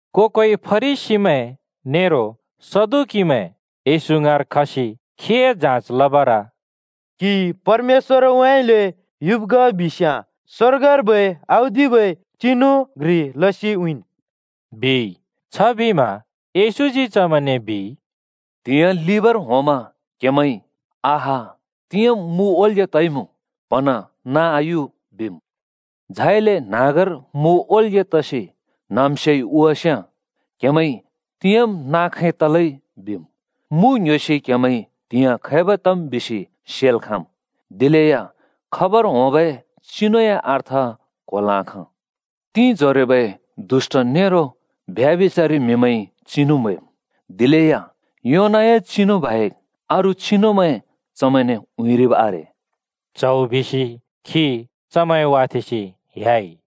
को-कोइ फरिसीमैं नेरो सदुकीमैं येशू ङाँर खसि खीए जाँच लबर “क्‍हि परमेश्‍वरउँइँले युब् ग बिस्‍याँ स्वर्गर्बै औदिबै चिनु घ्रि लसि उँइँन्,” बिइ। छबिमा येशूजी चमैंने बिइ, “त्‍हिंयाँ लिबर होंमा क्‍हेमैंइ ‘आहा, तिंयाँम् मु ओल्‍ग्‍या तइमुँ प्‍हँन्हाँ नाँ आयु बिम्।’ झाइले न्‍हाँगर मु ओल्‍ग्‍या तसि न्हाँम्स्योइ हुवास्याँ क्‍हेमैंइ ‘तिंयाँम् नाँ खैं तलै बिम्।’ मु ङ्‌ह्‍योसि क्‍हेमैंइ त्हिंइ खैब तम् बिसि सेल् खाँम्, दिलेया खबर होंबै चिनुए अर्थ क्होल् आखाँ। तिंजोरोबै दुष्‍ट नेरो ब्यभिचारि म्हिमैंइ चिनु म्हैम्, दिलेया योनाए चिनु बाहेक् अरू चिनुमैं चमैंने उँइँरिब् आरे।” च्हौ बिसि खी चमैं वाथेंसि ह्‍याइ।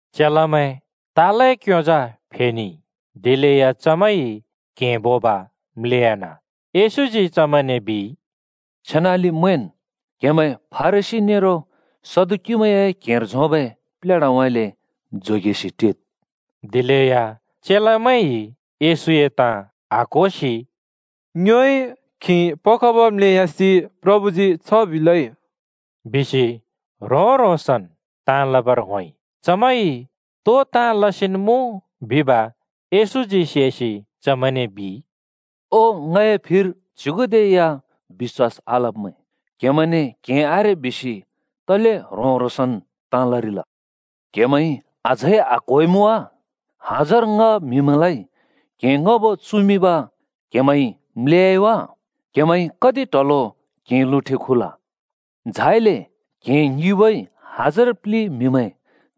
चेलामैं तालए क्‍योंजा फेनेइ, दिलेया चमैंइ क्हें बोब म्‍लेयान। येशूजी चमैंने बिइ, “छेनाले मैंन्, क्‍हेमैं फरिसी नेरो सदुकीमैंए क्हेंर झोंबै प्लेढाउँइँले जोगेसि टिद्।” दिलेया चेलामैंइ येशूए ताँ आक्‍होसि “ङ्योइ क्‍हें पखब म्‍लेयासि प्रभुजी छ बिलै,” बिसि ह्रों-ह्रोंसन् ताँ लबर होंइ। चमैंइ तो ताँ लसिन् मुँ बिब येशूजी सेसि चमैंने बिइ, “ओ, ङए फिर च्‍युगुदे या बिश्‍वास आलब्मैं! क्‍हेमैंने क्‍हें आरे बिसि तले ह्रों-ह्रोंसन् ताँ लरिल? क्‍हेमैंइ अझै आक्‍होइमुँ वा? हजार ङ्‌ह म्‍हिमैंलाइ क्‍हें ङ्‌हबो चुमिंब म्‍लेह्‍याइ वा? क्हेमैंइ कति ट्हलो क्‍हें लुँठे खुल? झाइले क्‍हें ङिबोइ हजार प्‍लि म्‍हिमैं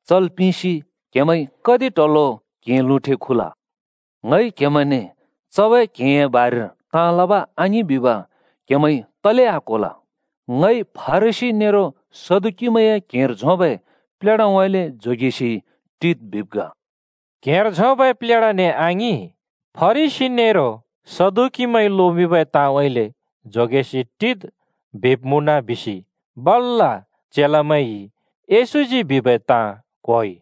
चल् पिंसि क्हेमैंइ कति ट्हलो क्‍हें लुँठे खुल? ङइ क्‍हेमैंने चबै क्हेंए बारेर ताँ लब आङिं बिब क्‍हेमैंइ तले आक्‍होल? ङइ फरिसी नेरो सदुकीमैंए क्हेंर झोंबै प्लेढाउँइँले जोगेसि टिद् बिब् ग।” क्‍हेंर झोंबै प्लेढाने आङिं, फरिसी नेरो सदुकीमैंइ लोमिंबै ताँउँइँले जोगेसि टिद् बिब् मुँन बिसि बल्‍ल चेलामैंइ येशूजी बिबै ताँ क्‍होइ।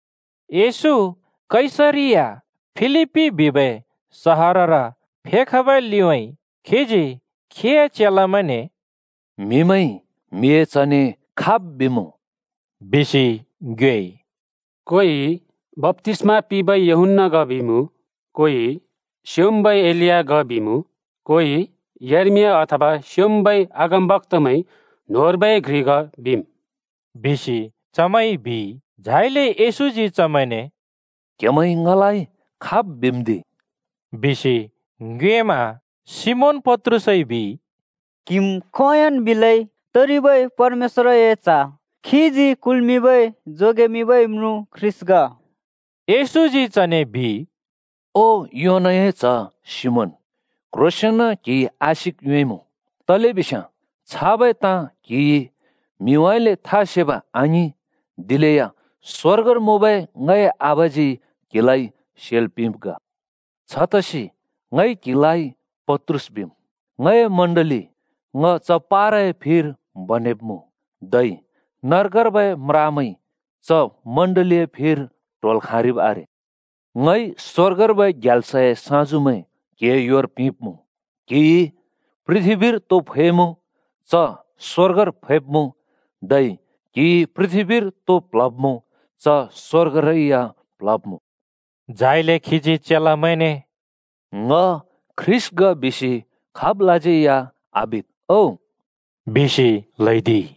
येशू कैसरिया फिलिप्पी बिबै सहरर फेखबै लिउँइँ खीजी खीए चेलामैंने “म्‍हिमैंइ म्हिए च्हने खाब् बिमुँ?” बिसि ङ्योएइ। “कोइ बप्‍तिस्‍मा पिंबै यूहन्‍ना ग बिमुँ, कोइ स्योंम्बै एलिया ग बिमुँ, कोइ यर्मिया अथवा स्योंम्बै अगमबक्‍तामैं न्होंर्बै घ्रि ग बिम्,” बिसि चमैंइ बिइ। झाइले येशूजी चमैंने “क्‍हेमैंइ ङलाइ खाब् बिम्दि?” बिसि ङ्योएमा सिमोन पत्रुसइ बिइ, “क्‍हिम् खोंयोंन् बिलै तरिबै परमेश्‍वरए च्ह, खीजी कुल्मिंबै जोगेमिंबै म्रुँ ख्रीष्‍ट ग।” येशूजी चने बिइ, “ओ, योनाए च्‍ह सिमोन, क्‍ह्रोसेंन क्‍हिइ आशिक योंइमुँ! तलेबिस्याँ छाबै ताँ क्‍हिइ म्‍हिउँइँले था सेब आङिं, दिलेया स्‍वर्गर मुँबै ङए आबाजी क्हिलाइ सेल् पिंब् ग। छतसि ङइ क्‍हिलाइ पत्रुस बिम्। ङए चर्च ङ च पाराए फिर बनेब्‍मुँ, धै नर्गर्बै म्रामैंइ च चर्चए फिर ट्होल् खाँरिब् आरे। ङइ स्‍वर्गर्बै ग्याल्सए साँजुमैं क्‍हिए योर पिंब्‍मुँ। क्हिइ पृथ्‍बीर तो फैब्मुँ च स्वर्गर फैब्मुँ, धै क्हिइ पृथ्‍बीर तो प्ल्हब्मुँ च स्वर्गरै या प्ल्हब्मुँ।” झाइले खीजी चेलामैंने “ङ ख्रीष्‍ट ग बिसि खाबलाज्यै या आबिद् ओ,” बिसि ल्हैदिइ।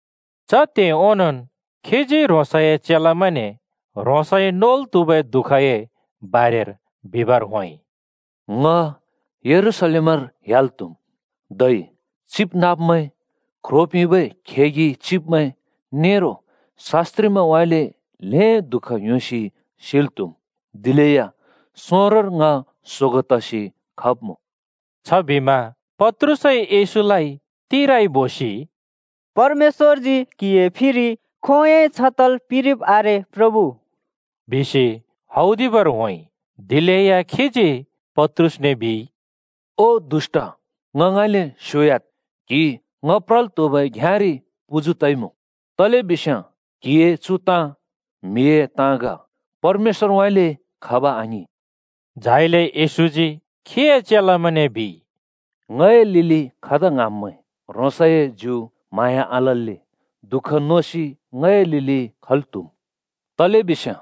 च त्हे ओंनोंन् खीजी ह्रोंसए चेलामैंने ह्रोंसइ नोल् त्हुबै दुःखए बारेर बिबर होंइ। “ङ यरूशलेम ह्‍याल् त्हुम्, धै चिबनाँब्मैं, ख्रो पिंबै खेगि चिब्मैं नेरो शास्‍त्रिमैंउँइँले ल्हें दुःख योसि सिल् त्हुम्। दिलेया सोंरोंर ङ सोगों तसि खब्मुँ।” छबिमा पत्रुसइ येशूलाइ तिराइ बोसि “परमेश्‍वरजी क्हिए फिरि खोंयोंइ छ तल् पिंरिब् आरे प्रभु,” बिसि हौदिबर होंइ। दिलेया खीजी पत्रुसने बिइ, “ओ दुष्‍ट, ङ ङाँइँले स्‍योह्‍याद्। क्‍हि ङ प्रल् त्‍हुबै घ्‍याँरि पुजु तइमुँ, तलेबिस्याँ क्‍हिए चु ताँ म्‍हिए ताँ ग, परमेश्‍वरउँइँले खब आङिं।” झाइले येशूजी खीए चेलामैंने बिइ, “ङए लिलि खदा ङ्हाँम्मैं, ह्रोंसए ज्यु म्हाँया आलल्‍ले दुःख नोसि ङए लिलि खल् त्‍हुम्। तलेबिस्याँ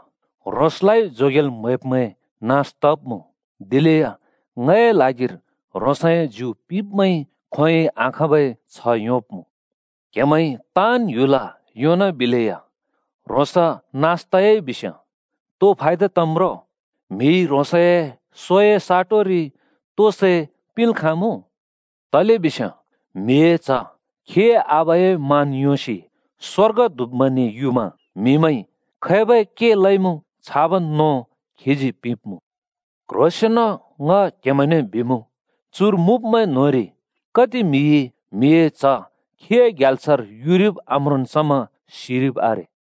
ह्रोंसलाइ जोगेल् म्‍हैब्मैं नास तब्‍मुँ। दिलेया ङए ल्हागिर ह्रोंसए ज्यु पिब्मैंइ खोंयोंइ आखाँबै छ्ह योंब्‍मुँ। क्हेमैंइ ताँन् ह्‍युल योंनाबिलेया ह्रोंस नास तयाइ बिस्‍याँ तो फायदा तम् रो? म्हिइ ह्रोंसए सोए साटोरि तो सै पिंल् खामुँ? तलेबिस्याँ म्हिए च्ह खीए आबाए मान योंसि स्‍वर्गदूतमैंने युमा म्‍हिमैंइ खैबै के लइमुँ छाबन् नों खीजी पिंब्‍मुँ। क्ह्रोंसेंन ङ क्हेमैंने बिमुँ, चुर मुँब्मैं न्होंरि कति म्हिइ म्हिए च्ह खीए ग्याल्सर युरिब आम्रोंन् समा सिरिब् आरे।”